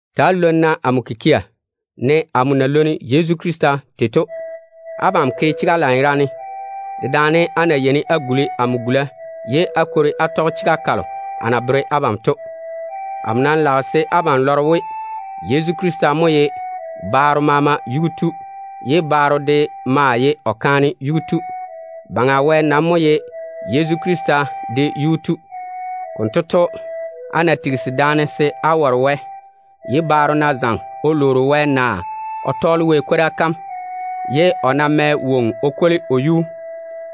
Ta‑á lwoni-na amo kikia, ne amo na lwoni Yezu Krista tei to. Abam ke chega lanyerane dedaane á na yeini á guli amo gula, ye á kwori á tɔge chega kalo a na bere abam to. Amo nam lage se abam lɔre we, Yezu Krista mo ye baaro maama yuu tu, ye baaro de maa ye o kaane yuu tu. Baŋa Wɛ nam mo ye Yezu Krista de yuu tu. Konto to, á ná tigisi daane se á ware Wɛ, ye baaro ná zaŋe o lwoori Wɛ, naa o tɔɔle Wɛ kwora kam, ye o ná mɛ woŋo o kwoli o yuu,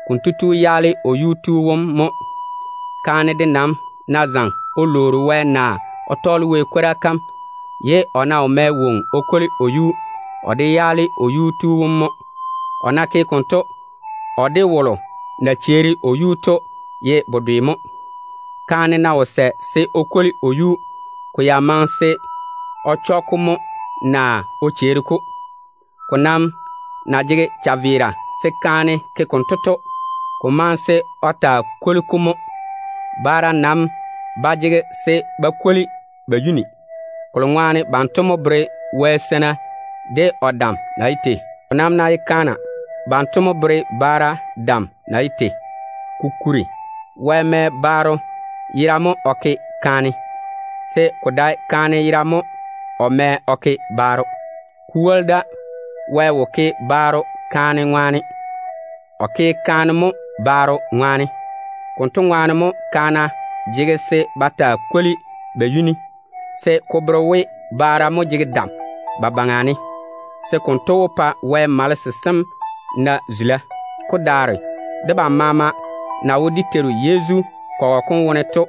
konto tu yaale o yuu tu wom mo. Kaane de nam ná zaŋe o lwoori Wɛ, naa o tɔɔle Wɛ kwora kam, ye o ná wo mɛ woŋo o kwoli o yuu, o de yaale o yuu tu wom mo. O ná ke konto, o de wolo na cheeri o yuu to ye bedwe mo. Kaane ná wo sɛ se o kwoli o yuu, ko ya maŋe se o chɔ-ko mo, naa o cheeri-ko. Ko nam na jege chaveera se kaane ke konto to, ko maŋe se o taa kwoli-ko mo. Baara nam ba jege se ba kwoli ba yuni, kolo ŋwaane banto mo bere Wɛ seina de o dam na ye tei. Ko nam ná ye kaana, banto mo bere baara dam na ye tei. Kokuri, Wɛ mɛ baaro yera mo o ke kaane, se ko dae kaane yera mo o mɛ o ke baaro. Ko woli da, Wɛ wo ke baaro kaane zeinim ŋwaane, o ke kaane mo baaro zeinim ŋwaane. Konto ŋwaane mo kaana jege se ba taa kwoli ba yuni, se ko bere dam delo na tei-ba to. Konto wó pa Wɛ malese sem na zula. Ko nam ná ye debam balo na me de dé Teiru Yezu to,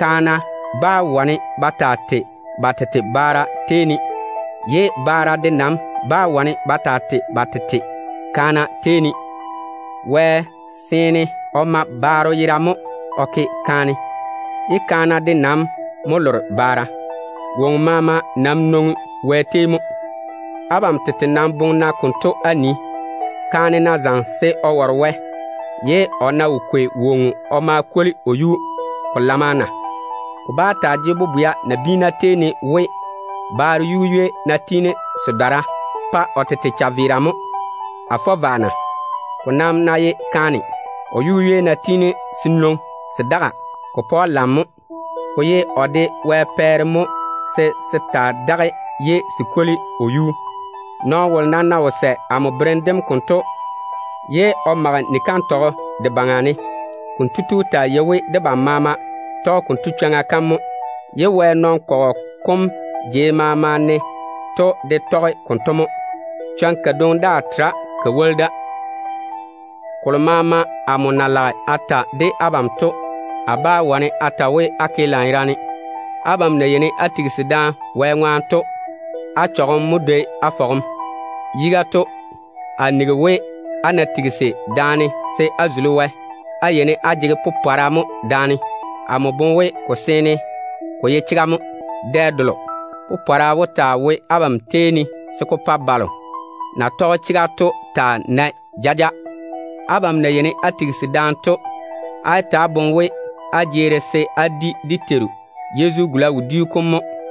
kaana bá wane ba taa tei ba tete baara tei ne, ye baara de nam bá wane ba taa tei ba tete kaana tei ne. Wɛ déem seene o ma baaro yera mo o ke kaane, ye kaana de nam mo lore baara. Woŋo maama nam nwoŋi Wɛ tei mo. Abam tete nam boŋe-na konto wone á nii. Kaane ná zaŋe se o ware Wɛ, ye o ná wo kwei woŋo o ma kwoli o yuu, ko ye ko chwoŋa ne na? Ko ba jege bobwea nabiina tei ne we, baaro yu-ywei ná tiini se dɔra, ko pa o tete chaveera mo. A fɔ vwa na? Ko nam ná ye kaane, o yu-ywei ná tiini se nwoŋi se daga, ko pa‑o lam mo. Ko ye o de Wɛ pɛɛre mo se se taa daga ye se kwoli o yuu. Nɔɔno wolo nam ná wo sɛ amo berem dem konto ye o mage ni-kantɔgɔ de baŋa ne, konto tu taa yei we, debam maama tɔge kanto chwoŋa kam mo. Wɛ nɔn-kɔgɔ kom jei maama ne to de tɔge-ka mo. Chwoŋa kadwoŋi daa tera ka woli da. Kolo maama amo na lage a ta de abam to, a bá wane a ta we á ke lanyerane. Abam ná yeini á tigisi daane Wɛ ŋwaane, á chɔgem mo dwoi á fɔgem. Yiga to, amo nigi we, á ná tigisi daane se á zuli Wɛ, á yeini á jege da-popɔra mo. Amo boŋe we ko seene ko ye chega mo. Dɛ delo, popɔra wó taa wo abam tei ne se ko pa balo na tɔge chega to taa nae jaja. Á na yeini á tigisi daane tei to, á yé ta‑á boŋe we, á jeeri se á di dé Teiru Yezu gula wodiu kom mo.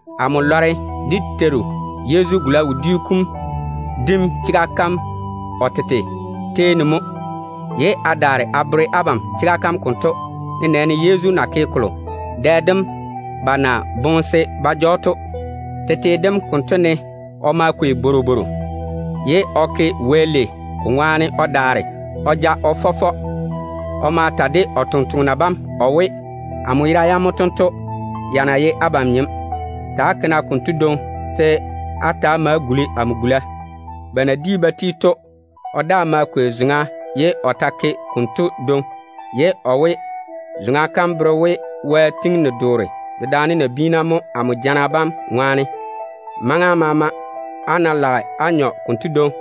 Amo lɔre dé Teiru Yezu gula wodiu kom dim chega kam o tete tei ne mo, ye a daare a bere abam chega kam konto, nenɛɛne Yezu na ke kolo dɛ dem ba na boŋe se ba ja‑o to. Tete dem konto ne o ma kwei bworobworo, ye o ke Wɛ lei ko ŋwaane o daare o ja-ko o fɔ fɔ. O ma ta de o tontoŋena bam o we, “Amo yera yam mo tento, ya na ye abam nyem. Ta‑á ke-na konto dwoŋi se á ta‑á ma á guli amo gula.” Ba na di ba ti to, o daa ma kwei zoŋa, ye o ta ke konto dwoŋi. O maa we, “Zoŋa kam bere we, Wɛ tɔge amo jana bam ŋwaane o gwoni ni-doore dedaane nabiina mo. Maŋa maama á ná lage á nyɔ konto dwoŋi,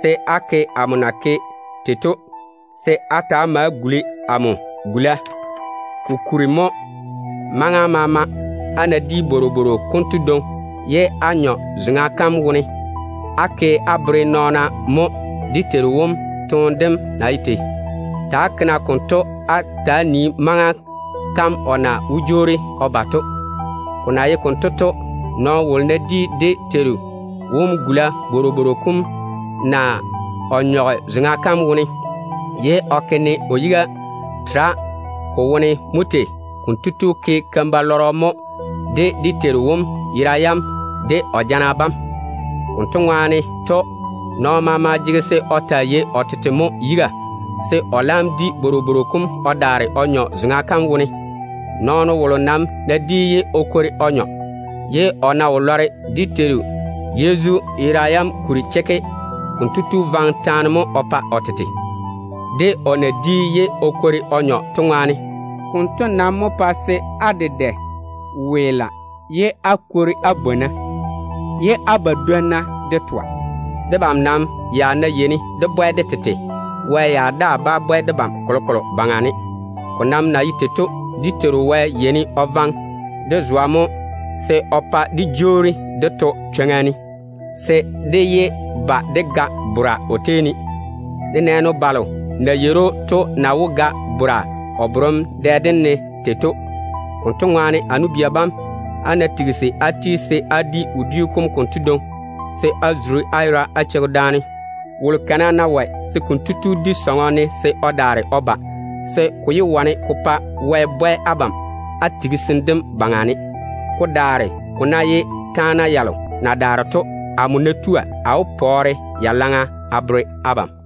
se á ke amo na ke tei to, se á ma á guli amo gula.” Kokuri to, maŋa maama á ná di bworobworo konto dwoŋi ye á nyɔ zoŋa kam wone, á ke á bere nɔɔna mo dé Teiru wom toone dem na ye tei. Ta‑á ke-na konto se ko taa vei maŋa kam o na wó jwoori o ba to. Ko na ye konto to, nɔɔno wolo ná di dé Teiru wom gula bworobworo kom naa o nyɔge zoŋa kam wone, ye o ke ne o yiga tera ko wone mo tei, konto tu ke keim-balɔrɔ mo o ma yaale dé Teiru wom yera yam de o jana bam. Konto ŋwaane to, nɔɔno maama jege se o taa yei o tete mo yiga, se o laam di bworobworo kom o daare o nyɔ zoŋa kam wone. Nɔɔno wolo nam ná di ye o kwori o nyɔ, ye o ná wo lɔre dé Teiru Yezu yera yam kuri chekke, konto tu vaŋe taane mo o pa o tete, de o na di ye o kwori o nyɔ tei to. Konto nam mo pae se á dedɛ weela ye á bwona, ye á badwonna de toa. Debam nam ya ná yeini dé bwɛ de tete, Wɛ ya daa bá bwɛ debam kolokolo baŋa ne. Ko nam na ye tei to, dé Teiru wom yeini o korese debam mo se o pa dé jwoori dé to chwoŋa ne, se dé yé ba dé ga bora o tei ne, nenɛɛne balo na yeiri‑o to na wó ga bora o borem dɛ dem ne tei to. Konto ŋwaane, a nu-bia bam, á ná tigisi á ti se á di wodiu kom konto dwoŋi, se á zuri á yera á cheigi da-tei ne. Wolo kana ná wɔe, se kotu di sɔŋɔ ne se o daare o ba, se ko yé wane ko pa Wɛ bwɛ abam á tigisim dem baŋa ne. Ko daare ko ná ye taana yalo na daare to, amo ná tua, a wó pɔɔre ya laŋa a bere abam.